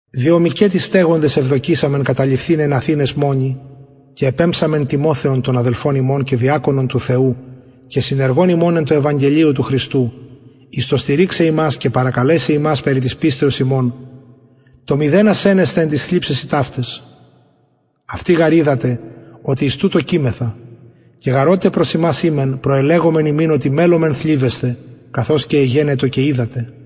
διο μηκετι στεγοντες ευδοκησαμεν καταλειφθηναι εν αθηναις μονοι και επεμψαμεν τιμοθεον τον αδελφον ημων και διακονον του θεου και συνεργον ημων εν τω ευαγγελιω του χριστου εις το στηριξαι υμας και παρακαλεσαι υμας περι της πιστεως υμων το μηδενα σαινεσθαι εν ταις θλιψεσιν ταυταις αυτοι γαρ οιδατε οτι εις τουτο κειμεθα και γαρ οτε προς υμας ημεν προελεγομεν υμιν οτι μελλομεν θλιβεσθαι καθως και εγενετο και οιδατε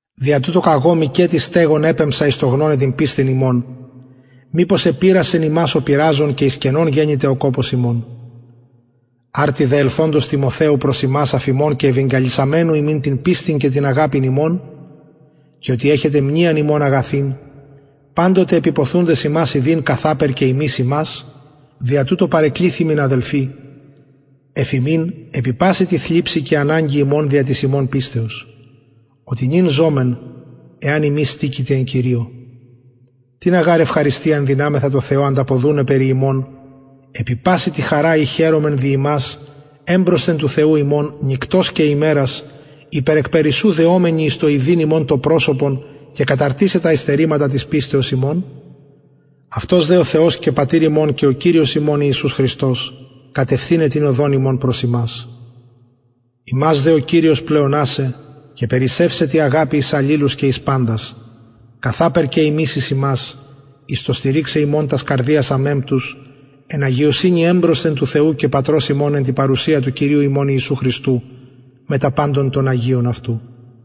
δια τουτο καγω μηκετι στεγων επεμψα εις το γνωναι την πιστιν υμων μηπως επειρασεν υμας ο πειραζων και εις κενον γενηται ο κοπος ημων αρτι δε ελθοντος τιμοθεου προς ημας αφ υμων και ευαγγελισαμενου ημιν την πιστιν και την αγαπην υμων και οτι εχετε μνειαν ημων αγαθην παντοτε επιποθουντες ημας ιδειν καθαπερ και ημεις υμας δια τουτο παρεκληθημεν αδελφοι εφ υμιν επι παση τη θλιψει και αναγκη ημων δια της υμων πιστεως οτι νυν ζωμεν εαν υμεις στηκετε εν κυριω τινα γαρ ευχαριστιαν δυναμεθα τω θεω ανταποδουναι περι υμων επι παση τη χαρα η χαιρομεν δι υμας εμπροσθεν του θεου ημων νυκτος και ημερας υπερ εκπερισσου δεομενοι εις το ιδειν υμων το προσωπον και καταρτισαι τα υστερηματα της πιστεως υμων αυτος δε ο θεος και πατηρ ημων και ο κυριος ημων ιησους χριστος κατευθυναι την οδον ημων προς υμας υμας δε ο κυριος πλεονασαι και περισσευσαι τη αγαπη εις αλληλους και εις παντας καθαπερ και ημεις εις υμας εις το στηριξαι υμων τας καρδιας αμεμπτους εν αγιωσυνη εμπροσθεν του θεου και πατρος ημων εν τη παρουσια του κυριου ημων ιησου χριστου μετα παντων των αγιων αυτου